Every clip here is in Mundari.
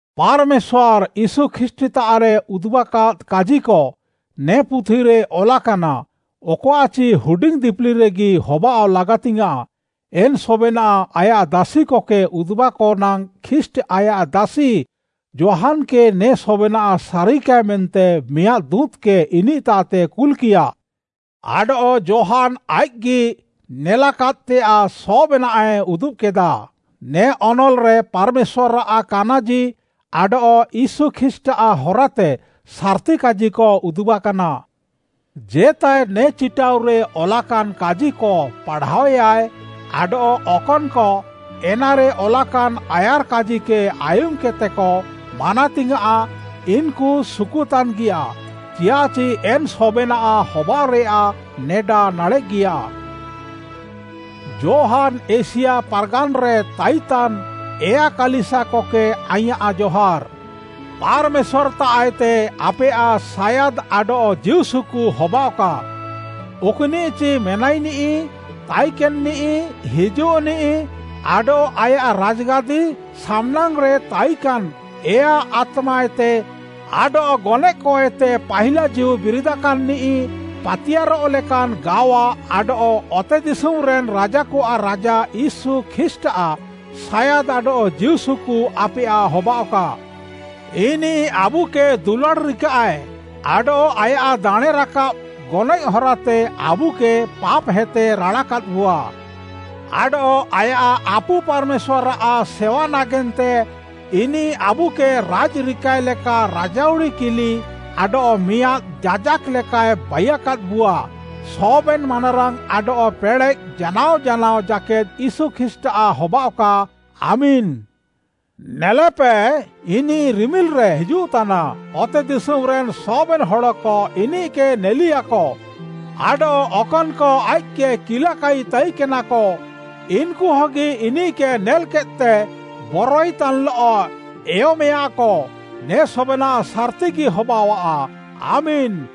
ପାର୍‌ମେଶ୍ୱାର୍‌, ୟୀଶୁ ଖ୍ରୀଷ୍ଟ୍‌ତାଃରେ ଉଦୁବାକାଦ୍‌ କାଜିକ ନେ ପୁଥିରେ ଅଲାକାନା, ଅକଆଃଚି ହୁଡିଙ୍ଗ୍‌ ଦିପିଲିରେଗି ହବାଅଃ ଲାଗାତିଙ୍ଗ୍‌ୟାଁଃ। ଏନ୍‌ ସବେନାଃ ଆୟାଃ ଦାସିକକେ ଉଦ୍‌ବାକ ନାଙ୍ଗ୍‌ ଖ୍ରୀଷ୍ଟ୍‌ ଆୟାଃ ଦାସି ଯୋହାନ୍‌କେ ନେ ସବେନାଃ ସାରିକାଏ ମେନ୍ତେ ମିଆଁଦ୍‌ ଦୁଁତ୍‌କେ ଇନିଃତାଃତେ କୁଲ୍‌କିୟା। ଆଡଃ ଯୋହାନ୍‌ ଆଇଃକ୍‌ଗି ନେଲାକାଦ୍‌ତେୟାଃ ସବେନାଃଏ ଉଦୁବ୍‌କେଦା। ନେ ଅନଲ୍‌ରେ ପାର୍‌ମେଶ୍ୱାର୍‌ଆଃ କାନାଜି ଆଡଃ ୟୀଶୁ ଖ୍ରୀଷ୍ଟ୍‌ଆଃ ହରାତେ ସାର୍‌ତି କାଜିକ ଉଦୁବାକାନା। ଜେତାଏ ନେ ଚିଟାଉରେ ଅଲାକାନ୍‌ କାଜିକ ପାଢ଼ାଅୟାଏ ଆଡଃ ଅକନ୍‌କ ଏନାରେ ଅଲାକାନ୍‌ ଆୟାର୍‌କାଜିକେ ଆୟୁମ୍‌କେଦ୍‌ତେକ ମାନାତିୟେଁଆ, ଇନ୍‌କୁ ସୁକୁତାନ୍‌ଗିୟା, ଚିଆଃଚି ଏନ୍‌ ସବେନାଃ ହବାଅଃରେୟାଃ ନେଡା ନାଡ଼େଃଗିୟା। ଯୋହାନ୍‌ ଏସିଆ ପାର୍‌ଗାନ୍‌ରେ ତାଇନ୍‌ତାନ୍‌ ଏୟା କାଲିସିୟାକକେ ଆଇଁୟାଃ ଜହାର୍‌। ପାର୍‌ମେଶ୍ୱାର୍‌ତାଃଏତେ ଆପେୟାଃ ସାୟାଦ୍‌ ଆଡଃ ଜୀଉସୁକୁ ହବାଅଃକା, ଅକ୍‌ନିଃଚି ମେନାଇନିଃ, ତାଇକେନ୍‍ନିଃ, ହିଜୁଃନିଃ, ଆଡଃ ଆୟାଃ ରାଜ୍‌ଗାଦି ସାମ୍‍ନାଙ୍ଗ୍‌ରେ ତାଇକାନ୍‌ ଏୟା ଆତ୍ମାତାଃଏତେ, ଆଡଃ ଗନଏଃକଏତେ ପାହିଲା ଜୀଉ ବିରିଦାକାନ୍‌ନିଃ, ପାତିୟାର୍‌ରଃ ଲେକାନ୍‌ ଗାୱା ଆଡଃ ଅତେଦିଶୁମ୍‌ରେନ୍‌ ରାଜାକଆଃ ରାଜା ୟୀଶୁ ଖ୍ରୀଷ୍ଟ୍‌ଆଃ ସାୟାଦ୍‌ ଆଡଃ ଜୀଉସୁକୁ ଆପେୟାଃ ହବାଅଃକା। ଇନିଃ ଆବୁକେ ଦୁଲାଡ଼୍‌ ରିକାଃଏ ଆଡଃ ଆୟାଃ ଦାଣେଁ ରାକାବ୍‌ ଗନଏଃ ହରାତେ ଆବୁକେ ପାପ୍‌ହେତେ ରାଡ଼ାକାଦ୍‌ବୁଆ। ଆଡଃ ଆୟାଃ ଆପୁ ପାର୍‌ମେଶ୍ୱାର୍‌ଆଃ ସେୱା ନାଗେନ୍ତେ ଇନିଃ ଆବୁକେ ରାଇଜ୍‌ ରିକାଏ ଲେକା ରାଜାଉଡ଼ି କିଲି ଆଡଃ ମିଆଁଦ୍‌ ଯାଜାକ୍‌ ଲେକାଏ ବାଇୟାକାଦ୍‍ବୁଆ। ସବେନ୍‌ ମାନାରାଙ୍ଗ୍‌ ଆଡଃ ପେଡ଼େଃ ଜାନାଅ ଜାନାଅ ଜାକେଦ୍‌ ୟୀଶୁ ଖ୍ରୀଷ୍ଟ୍‌ଆଃ ହବାଅଃକା! ଆମେନ୍‌। ନେଲେପେ, ଇନିଃ ରିମିଲ୍‍ରେ ହିଜୁଃତାନା, ଅତେଦିଶୁମ୍‌ରେନ୍‌ ସବେନ୍‌ ହଡ଼କ ଇନିଃକେ ନେଲିୟାକ, ଆଡଃ ଅକନ୍‌କ ଆଇଃକ୍‌କେ କିଲାକାଇ ତାଇକେନାକ ଇନ୍‌କୁ ହଗି ଇନିଃକେ ନେଲ୍‌କେଦ୍‌ତେ ବରୱାଇତାନ୍‌ଲଃ ଏୟମେୟାଁକ। ନେ ସବେନାଃ ସାର୍‌ତିଗି ହବାଅଆଃ! ଆମେନ୍‌।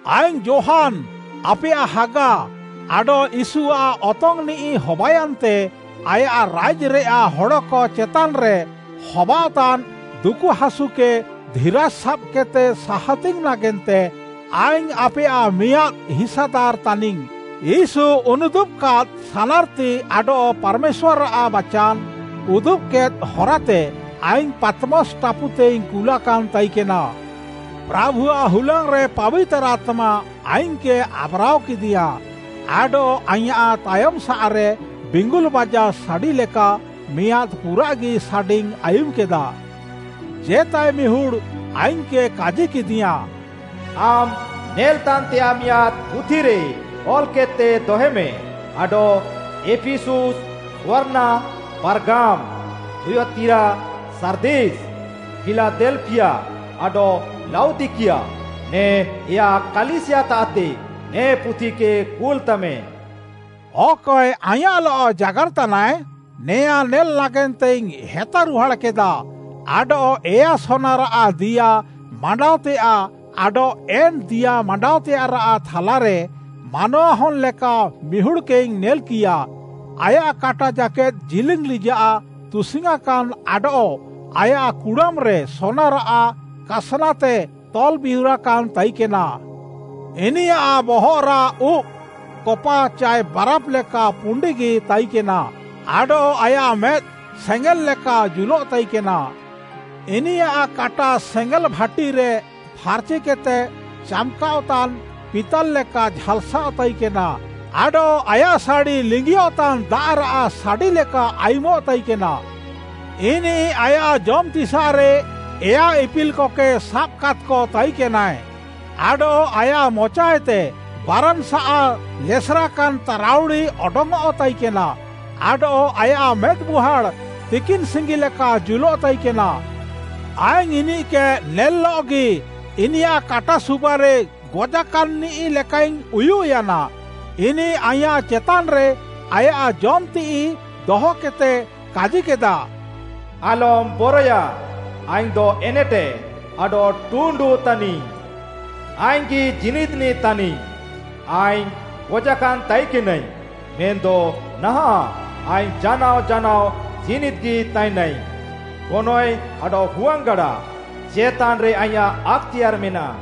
ଆଇଙ୍ଗ୍‌ ଯୋହାନ୍‌, ଆପେୟାଃ ହାଗା, ଆଡଃ ୟୀଶୁଆଃ ଅତଙ୍ଗ୍‌ନିଃ ହବାୟାନ୍ତେ ଆୟାଃ ରାଇଜ୍‌ରେୟାଃ ହଡ଼କ ଚେତାନ୍‌ରେ ହବାଅଃତାନ୍‌ ଦୁକୁହାସୁକେ ଧିରାଜ୍‌ ସାବ୍‌କେଦ୍‌ତେ ସାହାତିଙ୍ଗ୍‌ ନାଗେନ୍ତେ ଆଇଙ୍ଗ୍‌ ଆପେୟାଃ ମିଆଁଦ୍‌ ହିସାଦାର୍‌ ତାନିଙ୍ଗ୍‌। ୟୀଶୁ ଉନୁଦୁବ୍‌କାଦ୍‌ ସାନାର୍‌ତି ଆଡଃ ପାର୍‌ମେଶ୍ୱାର୍‌ଆଃ ବାଚାନ୍‌ ଉଦୁବ୍‌କେଦ୍‌ ହରାତେ ଆଇଙ୍ଗ୍‌ ପାତ୍‌ମସ୍‌ ଟାପୁତେଇଙ୍ଗ୍‌ କୁଲାକାନ୍‌ ତାଇକେନା। ପ୍ରାଭୁଆଃ ହୁଲାଙ୍ଗ୍‌ରେ ପାବିତାର୍‌ ଆତ୍ମା ଆଇଙ୍ଗ୍‌କେ ଆବ୍‌ରାଅକେଦିୟାଁ, ଆଡଃ ଆଇଁୟାଃ ତାୟମ୍‌ସାଃରେ ବିଙ୍ଗୁଲ୍‌ ବାଜା ସାଡ଼ିଲେକା ମିଆଁଦ୍‌ ପୁରାଃଗି ସାଡ଼ିଇଙ୍ଗ୍‌ ଆୟୁମ୍‌କେଦା। ଜେତାଏ ମିହୁଡ଼୍‌ ଆଇଙ୍ଗ୍‌କେ କାଜିକେଦିୟାଁ, “ଆମ୍ ନେଲ୍‌ତାନ୍‌ତେୟାଃ ମିଆଁଦ୍‌ ପୁଥିରେ ଅଲ୍‌କେଦ୍‌ତେ ଦହେମେ ଆଡଃ ଏଫିସୁସ୍‌, ସ୍ମର୍ଣ୍ଣା, ପାର୍ଗାମ୍‌, ଥୁୟତିରା, ସାର୍ଦିସ୍, ଫିଲାଦେଲ୍‍ଫିୟା, ଆଡଃ ଲାଉଦିକିଆ, ନେ ଏୟା କାଲିସିୟାତାଃତେ ନେ ପୁଥିକେ କୁଲ୍‌ତାମେ।” ଅକଏ ଆଇଁୟାଃଲଃ ଜାଗାର୍‌ତାନାଏ, ନେଆଁ ନେଲ୍‌ ନାଗେନ୍ତେଇଙ୍ଗ୍‌ ହେତାରୁହାଡ଼୍‌କେଦା ଆଡଃ ଏୟା ସୋନାରାଃ ଦିଆ ମାଣ୍ଡାଅତେୟାଃ, ଆଡଃ ଏନ୍‌ ଦିଆ ମାଣ୍ଡାଅତେୟାଃରାଃ ଥାଲାରେ ମାନୱାହନ୍‌ଲେକା ମିହୁଡ଼୍‌କେଇଙ୍ଗ୍‌ ନେଲ୍‌କିୟା। ଆୟାଃ କାଟା ଜାକେଦ୍‌ ଜିଲିଙ୍ଗ୍‌ ଲିଜାଃ ତୁସିଙ୍ଗ୍‌ୟାଁକାନ୍‌ ଆଡଃ ଆୟାଃ କୁଡ଼ାମ୍‌ରେ ସୋନାରାଃ କାସ୍‌ନାତେ ତଲ୍‌ବିହୁରାକାନ୍‌ ତାଇକେନା। ଇନିୟାଃ ବହଃରାଃ ଉବ୍‌, କପା ଚାଏ ବାରାଫ୍‌ ଲେକା ପୁଣ୍ଡିଗି ତାଇକେନା ଆଡଃ ଆୟାଃ ମେଦ୍‌ ସେଙ୍ଗେଲ୍ ଲେକା ଜୁଲଃତାଇକେନା। ଇନିୟାଃ କାଟା ସେଙ୍ଗେଲ୍‌ ଭାଟିରେ ଫାର୍‌ଚିକେଦ୍‌ତେ ଚାମ୍‌କାଅଃତାନ୍‌ ପିତାଲ୍‌ ଲେକା ଝାଲ୍‌ସାଃଅ ତାଇକେନା ଆଡଃ ଆୟାଃ ସାଡ଼ି ଲିଙ୍ଗିୟଃତାନ୍‌ ଦାଆଃରାଃ ସାଡ଼ି ଲେକା ଆୟୁମଃ ତାଇକେନା। ଇନିଃ ଆୟାଃ ଜମ୍‌ତିସାଃରେ ଏୟା ଇପିଲ୍‌କକେ ସାବାକାଦ୍‌କ ତାଇକେନାଏ, ଆଡଃ ଆୟାଃ ମଚାଏତେ ବାରାନ୍‌ସାଃ ଲେସେରାକାନ୍‌ ତାରାଉଡ଼ି ଅଡଙ୍ଗ୍‌ଅଃ ତାଇକେନା, ଆଡଃ ଆୟାଃ ମେଦ୍‌ମୁହାଁଡ଼୍‌ ତିକିନ୍‌ ସିଙ୍ଗି ଲେକା ଜୁଲଃ ତାଇକେନା। ଆଇଙ୍ଗ୍‌ ଇନିଃକେ ନେଲ୍‍ଲଃଗି ଇନିୟାଃ କାଟା ସୁବାରେ ଗଜାକାନ୍‌ନିଃ ଲେକାଇଙ୍ଗ୍‌ ଉୟୁଃୟାନା। ଇନିଃ ଆଇଁୟାଃ ଚେତାନ୍‌ରେ ଆୟାଃ ଜମ୍‌ତିଃଇ ଦହକେଦ୍‌ତେ କାଜିକେଦା, “ଆଲମ୍‌ ବରଏୟା! ଆଇଙ୍ଗ୍‌ଦ ଏନେଟେଦ୍‌ ଆଡଃ ଟୁଣ୍ଡୁ ତାନିଙ୍ଗ୍‌। ଆଇଙ୍ଗ୍‌ଗି ଜୀନିଦ୍‌ନିଃ ତାନିଙ୍ଗ୍‌, ଆଇଙ୍ଗ୍‌ ଗଜାକାନ୍‍ ତାଇକେନାଇଙ୍ଗ୍‌, ମେନ୍‌ଦ ନାହାଁଃ ଆଇଙ୍ଗ୍‌ ଜାନାଅ ଜାନାଅ ଜୀନିଦ୍‌ଗି ତାଇନାଇଙ୍ଗ୍‌। ଗନଏଃ ଆଡଃ ହୁଆଙ୍ଗ୍‌ଗାଡ଼ା ଚେତାନ୍‌ରେ ଆଇଁୟାଃ ଆକ୍‌ତେୟାର୍‌ ମେନାଃ।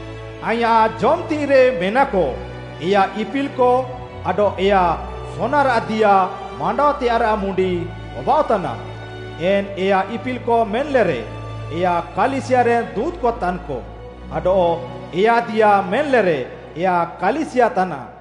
ଆଇଁୟାଃ ଜମ୍‌ତିଃଇରେ ମେନାକ ଏୟା ଇପିଲ୍‍କ ଆଡଃ ଏୟା ସୋନାରାଃ ଦିଆ ମାଣ୍ଡାଅତେୟାଃରାଃ ମୁଣ୍ଡି ହବାଅଃ ତାନା, ଏନ୍ ଏୟା ଇପିଲ୍‍କ ମେନ୍‌ଲେରେ ଏୟା କାଲିସିୟାରେନ୍‍ ଦୁଁତ୍‌କ ତାନ୍‌କ ଆଡଃ ଏୟା ଦିଆ ମେନ୍‌ଲେରେ ଏୟା କାଲିସିୟା ତାନାଃ।